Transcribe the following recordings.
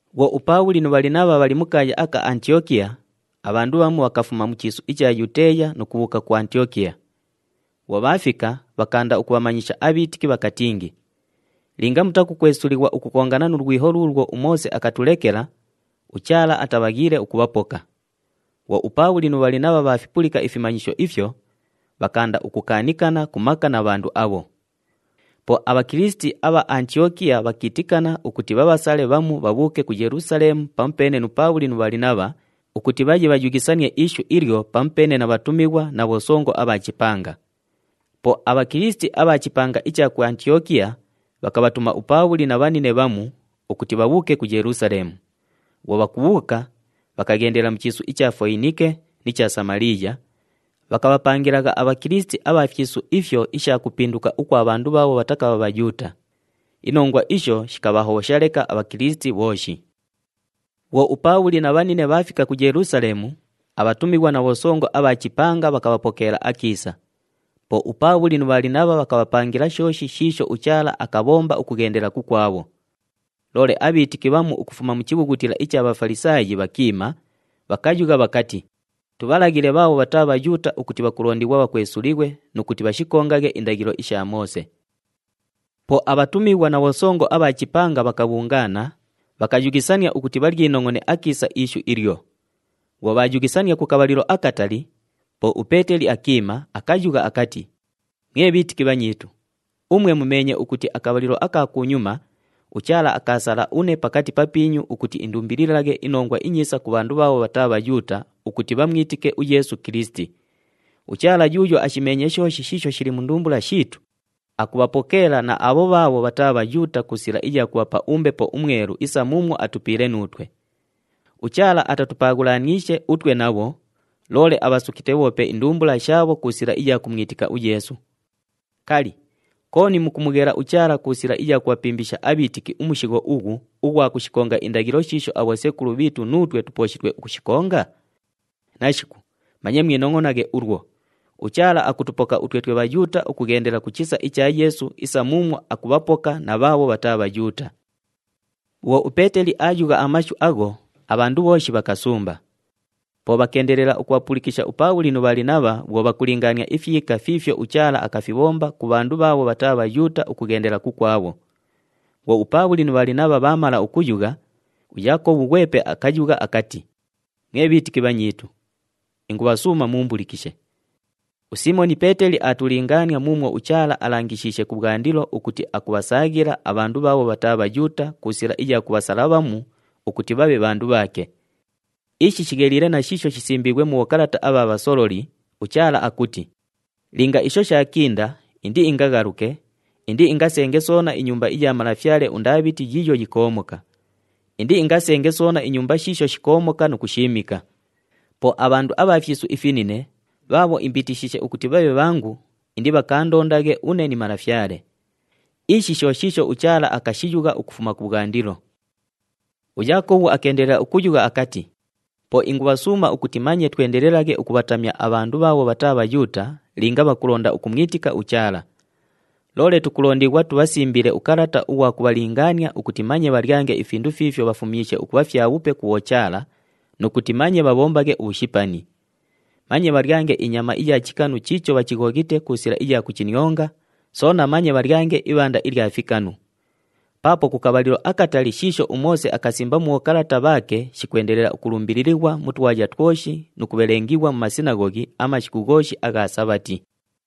Bhwo uPaabhuli nu Bhalinabha bhali mu kaaya aka Antiyokiya, abhandu bhamu bhakafuma mu chiisu icha Yuteeya nu kubhuuka ku Antiyokiya. Bhwo bhaafika, bhakaanda ukubhamanyisha abhiitiki bhakatingi, “Linga mutakukwesulighwa ukukongana nu lwiho luulwo uMoose akatulekela, uChaala atabhaghiile ukubhapoka.” Bhwo uPaabhuli nu Bhalinabha bhaafipulika ifimanyisho ifyo, bhakaanda ukukaanikana ku maka na bhandu abho. Po aBhakilisiti abha Antiyokiya bhakiitikana ukuti bhabhasale bhamu bhabhuuke ku Yelusaleemu pamupeene nu Paabhuli nu Bhalinabha ukuti bhaye bhayughisanie ishu ilyo pamupeene na bhatumighwa na bhosongo abha chipanga. Po aBhakilisiti abha chipanga icha ku Antiyokiya bhakabhatuma uPaabhuli na bhanine bhamu ukuti bhabhuuke ku Yelusaleemu. Bhwo bhakubhuuka, bhakaghendela mu chiisu icha Foyinike ni cha Samaliiya, bhakabhapangilagha aBhakilisiti abha fyisu ifyo isha kupinduka ukwa bhandu bhaabho bhatakabha Bhayuuta. Inongwa isho shikabhahobhosha leka aBhakilisiti bhooshi. Bhwo uPaabhuli na bhanine bhaafika ku Yelusaleemu, abhatumighwa na bhosongo abha chipanga bhakabhapokeela akiisa. Po uPaabhuli nu Bhalinabha bhakabhapangila shooshi shiisho uChaala akabhomba ukughendela kukwabho. Loole abhiitiki bhamu ukufuma mu chibhughutila icha Bhafalisaayi bhakiima, bhakayugha bhakati, “Tubhalaghile bhaabho bhataa Bhayuuta ukuti bhakulondighwa bhakwesulighwe nu kuti bhashikongaghe indaghilo isha Moose.” Po abhatumighwa na bhosongo abha chipanga bhakabhungaana, bhakayughisania ukuti bhalyinongʼone akiisa ishu ilyo. Bhwo bhaayughisania ku kabhalilo akatali, po uPeeteli akiima, akayugha akati, “Mwe bhiitiki bhanyiitu, umwe mumeenye ukuti akabhalilo aka kunyuma uChaala akaasala une pakati papiinyu ukuti indumbililaghe iNongwa iNyiisa ku bhandu bhaabho bhataa Bhayuuta ukuti bhamwitike uYeesu Kilisiti. UChaala yuuyo ashimeenye shooshi shiisho shili mu ndumbula shiitu, akubhapokeela na abho bhaabho bhataa Bhayuuta ku sila iya kubhapa uMbepo uMwelu isa muumwo atupiile nuutwe. UChaala atatupaaghulaniishe utwe nabho, loole abhasukite bhoope indumbula shaabho ku sila iya kumwitika uYeesu. Kali, kooni mukumughela uChaala ku sila iya kubhapimbisha abhiitiki umushigho ughu ughwa kushikonga indaghilo shiisho abhosekulu bhiitu nuutwe tupooshitwe ukushikonga? Nashiku, manye mwinongʼonaghe ulwo! UChaala akutupoka utwe twe Bhayuuta ukughendela ku chisa icha Yeesu isa muumwo akubhapoka na bhaabho bhataa Bhayuuta.” Bhwo uPeeteli aayugha amashu agho, abhandu bhooshi bhakasumba. Po bhakeendelela ukubhapulikisha uPaabhuli nu Bhalinabha bhwo bhakulingaania ifyika fiifyo uChaala akafibhomba ku bhandu bhaabho bhataa Bhayuuta ukughendela kukwabho. Bhwo uPaabhuli nu Bhalinabha bhaamala ukuyugha, uYaakobhu ghwepe akayugha akati, “Mwe bhiitiki bhanyiitu, ingubhasuuma muumbulikishe. USiimoni Peeteli aatulingaania muumwo uChaala alangishiishe kubhwandilo ukuti akubhasaaghila abhandu bhaabho bhataa Bhayuuta ku sila iya kubhasala bhamu ukuti bhabhe bhandu bhaake. Ishi shigheliile na shiisho shisimbiighwe mu bhokalata abha bhasololi, uChaala akuti, ‘Linga isho shaakinda, indiingaghaluke, indiingasenge soona inyumba iya malafyale uNdaabhiti yiiyo yikoomoka. Indiingasenge soona inyumba shiisho shikoomoka nu kushiimika. Po abhandu abha fyisu ifinine, bhaabho imbiitishiishe ukuti bhabhe bhangu, indibhakaandondaghe une ni Malafyale. Ishi sho shiisho uChaala akashiyugha ukufuma kubhwandilo.’” UYaakobhu akeendelela ukuyugha akati, “Po ingubhasuuma ukuti manye twendelelaghe ukubhatamya abhandu bhaabho bhataa Bhayuuta linga bhakulonda ukumwitika uChaala. Loole tukulondighwa tubhasimbile ukalata ughwa kubhalingaania ukuti manye bhalyange ifindu fiifyo bhafumyishe ukubha fyabhupe ku bhochaala nu kuti manye bhabhombaghe ubhushipani. Manye bhalyange inyama iya chikanu chiicho bhachighoghite ku sila iya kuchinionga, soona manye bhalyange ibhanda ilya fikanu. Paapo ku kabhalilo akatali shiisho uMoose akasimba mu bhokalata bhaake shikwendelela ukulumbililighwa mu twaya twoshi nu kubhelengighwa mu masinaghoghi amashiku ghooshi agha Sabhati.”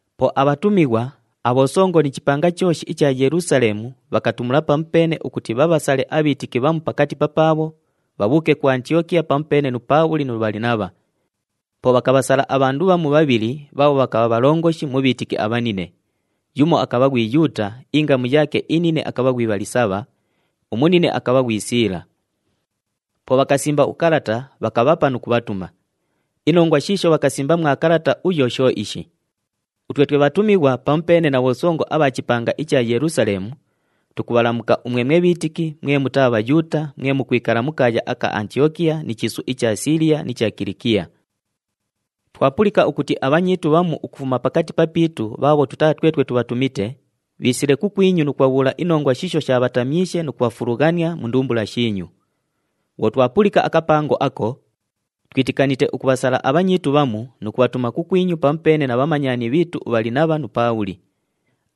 Po abhatumighwa, abhosongo ni chipanga chooshi icha Yelusaleemu bhakatumula pamupeene ukuti bhabhasale abhiitiki bhamu pakati papaabho, bhabhuuke ku Antiyokiya pamupeene nu Paabhuli nu Bhalinabha. Po bhakabhasala abhandu bhamu bhabhili bhaabho bhakabha bhalongoshi mu bhiitiki abhanine. Yumo akabha ghwi Yuuta, ingamu yaake inine akabha ghwi Bhalisabha, umunine akabha ghwi Siila. Po bhakasimba ukalata, bhakabhapa nu kubhatuma. Inongwa shiisho bhakasimba mwa kalata uyo sho ishi: Utwe twe bhatumighwa pamupeene na bhosongo abha chipanga icha Yelusaleemu, tukubhalamuka umwe mwe bhiitiki mwe mutaa Bhayuuta mwe mukwikala mu kaaya aka Antiyokiya ni chiisu icha Siiliya ni cha Kilikiya. Twapulika ukuti abhanyiitu bhamu ukufuma pakati papiitu bhaabho tutaa twetwe twabhatumite, bhiisile kukwinyu nu kubhabhuula inongwa shiisho shaabhatamyishe nu kubhafulughania mu ndumbula shiinyu. Bhwo twapulika akapango ako, twitikanite ukubhasala abhanyiitu bhamu nu kubhatuma kukwinyu pamupeene na bhamanyani bhiitu uBhalinabha nu Paabhuli.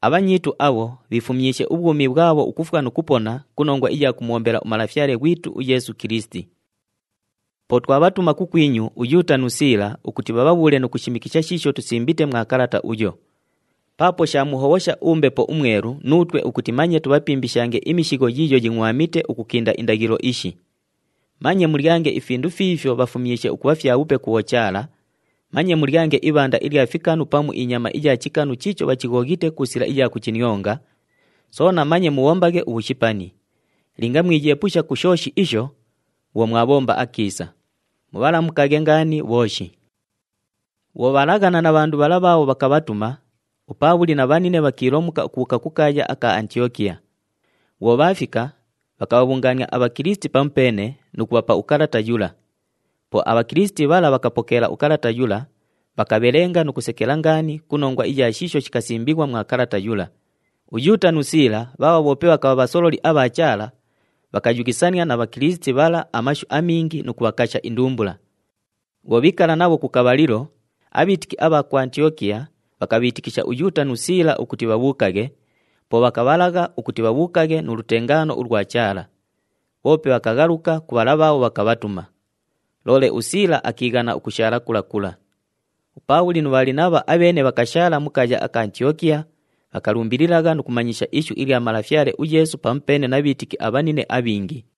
Abhanyiitu abho bhiifumyishe ubhwumi bhwabho ukufwa nu kupona ku nongwa iya kumubhombela uMalafyale ghwitu uYeesu Kilisiti. Po twabhatuma kukwinyu uYuuta nu Siila ukuti bhabhabhuule nu kushishimikisha shiisho tusimbite mwa kalata uyo. Paapo shaamuhobhosha uMbepo uMwelu nuutwe ukuti manye tubhapimbishange imishigho yiiyo yingʼwamite ukukinda indaghilo ishi. Manye mulyange ifindu fiifyo bhafumyishe ukubha fyabhupe ku bhochaala, manye mulyange ibhanda ilya fikanu pamu inyama iya chikanu chiicho bhachighoghite ku sila iya kuchinionga, soona manye mubhombaghe ubhushipani. Linga mwiyeepusha ku shooshi isho, bhwo mwabhomba akiisa. Mubhalamukaghe ngaani bhooshi! Bhwo bhaalaghana na bhandu bhala bhaabho bhakabhatuma, uPaabhuli na bhanine bhakiilomuka ukubhuuka ku kaaya aka Antiyokiya. Bhwo bhaafika, bhakabhabhungaania aBhakilisiti pamupeene nu kubhapa ukalata yula. Po aBhakilisiti bhala bhakapokeela ukalata yula, bhakabhelenga nu kusekela ngaani ku nongwa iya shiisho shikasimbighwa mwa kalata yula. UYuuta nu Siila bhaabho bhoope bhakabha bhasololi abha Chaala, bhakayughisania na Bhakilisiti bhala amashu amingi nu kubhakasha indumbula. Bhwo bhiikala nabho ku kabhalilo, abhiitiki abha ku Antiyokiya bhakabhiitikisha uYuuta nu Siila ukuti bhabhuukaghe, po bhakabhalagha ukuti bhabhuukaghe nu lutengaano ulwa Chaala. Bhoope bhakaghaluka ku bhala bhaabho bhakabhatuma. [ Loole uSiila akiighana ukushaala kula kula.] UPaabhuli nu Bhalinabha abheene bhakashaala mu kaaya aka Antiyokiya, bhakalumbililagha nu kumanyisha ishu ilya Malafyale uYeesu pamupeene na bhiitiki abhanine abhingi.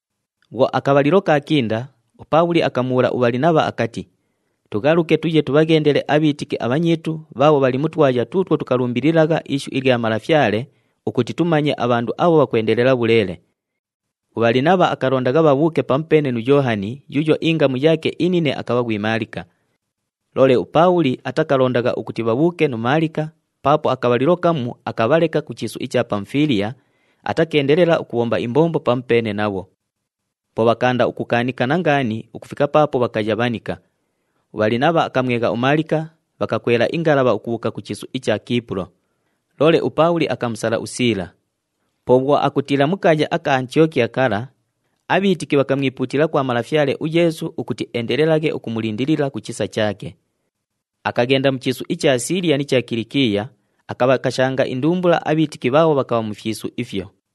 Bhwo akabhalilo kaakinda, uPaabhuli akamubhuula uBhalinabha akati, “Tughaluke tuye tubhaghendele abhiitiki abhanyiitu bhaabho bhali mu twaya tuutwo tukalumbililagha ishu ilya Malafyale, ukuti tumanye abhandu abho bhakwendelela bhuleele.” UBhalinabha akalondagha bhabhuuke pamupeene nu Yoohani yuuyo ingamu yaake inine akabha ghwi Maalika. Loole uPaabhuli atakalondagha ukuti bhabhuuke nu Maalika paapo akabhalilo kamu akabhaleka ku chiisu icha Pamufiiliya, atakeendelela ukubhomba imbombo pamupeene nabho. Po bhakaanda ukukaanikana ngaani ukufika paapo bhakayabhanika. UBhalinabha akamwegha uMaalika, bhakakwela ingalabha ukubhuuka ku chiisu icha Kiipulo. Loole uPaabhuli akamusala uSiila. Po bhwo akutiila mu kaaya aka Antiyokiya kala, abhiitiki bhakamwipuutila kwa Malafyale uYeesu ukuti eendelelaghe ukumulindilila ku chisa chaake. Akaghenda mu chiisu icha Siiliya ni cha Kilikiya, akabhakashanga indumbula abhiitiki bhaabho bhakabha mu fyisu ifyo.